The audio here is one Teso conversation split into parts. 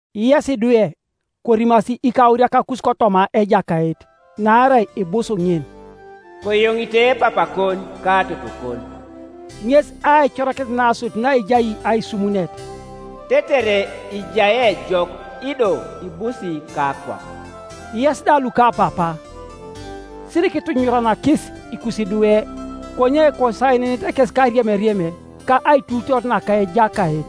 Yes idwe, korimasi ikauriakakus kotoma Ejakait, naarai ibus ŋin. “Koyoŋite papakon ka totokon” ŋes aicorakinet nasodit naejai aisumunet, “tetere ijai ejok ido ibusi kakwap.” Yes da lukapapa, sirikitunyunyuranakis ikusidwe, konye kosaenenete kes kariemiriem ka aituutoor naka Ejakait.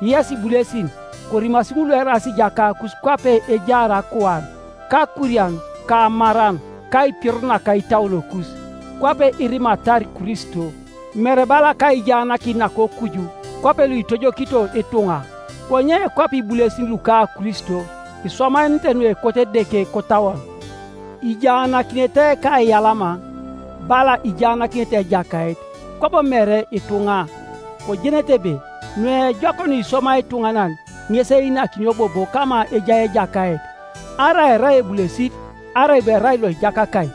Yes ibulesin, korimasi ŋul lueraas ijakakus kwape ejaar akuan, kakurian ka amaran kaipioror naka itauonokus, kwape irimatar Kristo; mere bala kaijaanakin nakokuju kwape luitojokito ituŋa, konye kwape ibulesin luka Kristo iswamaenenete nuekot Edeke kotauon, ijaanakinete kaiyalama, bala ijaanakinete Ejakait, kwabo mere ituŋa, kojenete ebe nuejok nuiswamai ituŋanan, ŋes einakinio bobo kama ejai Ejakait, arai erai ebulesit, arai bo erai loijakakai.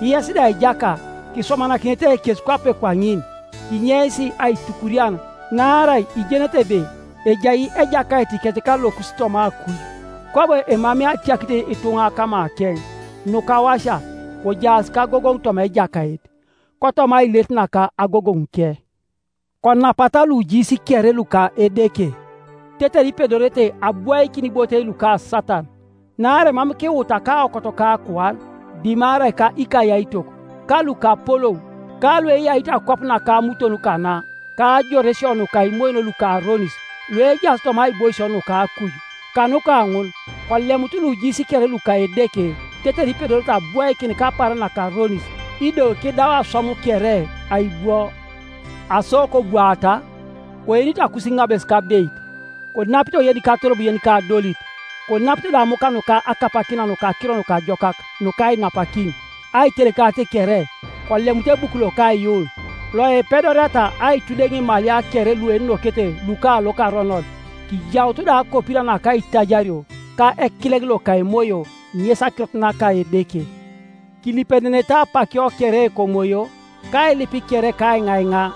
Yes da ijaka, kiswamanakinete kes kwape kwaŋin, kinyeis aitukurian, naarai ijenete ebe ejai Ejakaitikec ka lokus toma akuj, kwabo emamei atiakit ituŋa kamakeŋ. Nukawasia, kojaas kagogoŋ toma Ejakait, kotoma ailerit naka agogoŋuke. Konapata lujiis kere luka Edeke, tetere ipedorete abwoikin ibotei luka Satana. Naarai mam kiwuta kaokot ka akuan, dimarai ka ikayaitok, ka lukapolou, ka lueyaito akwap naka amuton kana, ka ajoresio nuka imoyon luka aronis, luejaas toma aiboisio nuka akuj. Kanuka ŋun kolemutu lujiis kere luka Edeke tetere ipedorete abwoikin kapaaran nakaronis, ido kidau aswam kere, aibwo. Aso kobwaata, koenito akusiŋabes kabeit, konapito yenikatorob yenika adolit, konapito da amuk nuka akapakina naka Akiro Nukajokak nuka ainapakin; aitelekarit kere, kolemutu ebuku loka aiyuun, loipedoriata aitudeŋ imalia kere luenokete luka lokaronon. Kijautu da akopira naka aitajario, ka ekileŋ loka Emoyo, ŋes akirot naka Edeke. Kilipenenete apakio kere kOmoyo, kailip kere ka aiŋaiŋa.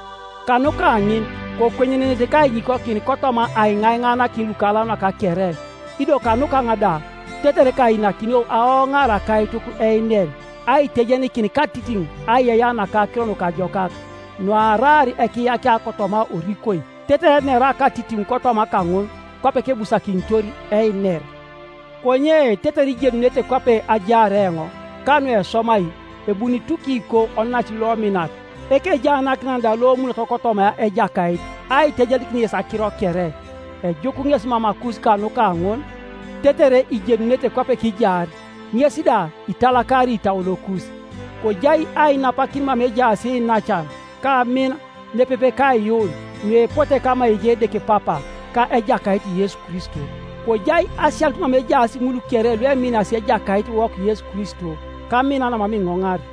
Kanuka ŋun kokwenyenenete kainyikokin kotoma aiŋaiŋaanakin lukalaunak kere, ido kanukaŋ da, tetere kainakinio aoŋaar akaituk einer, aitejenikin katitiŋ aiyeiyea naka Akiro Nukajokak, nuaraar ekiyakia kotoma orikoi; tetere enera katitiŋ kotoma kaŋun, kwape kebusakinitor einer. Konye tetere ijenunete kwape ajaar eoŋ, ka nueswamai, ebuni Tukiko onac lominat, ekejaanakinan da lomunot kotoma Ejakait aitejenikin yes akiro kere. Ejuk ŋes mamakus kanuka ŋun, tetere ijenunete kwape kijaar, ŋes da italakari itauonokus. Kojai ainapakin mama ejaas iinacan, ka amin, nepepe kaiyuun, nuepote kama ejai Edeke Papa, ka Ejakait Yesu Kristo. Kojai asianut mama ejaas ŋul kere lueminasi Ejakaitiwok Yesu Kristo kamina namam iŋoŋar.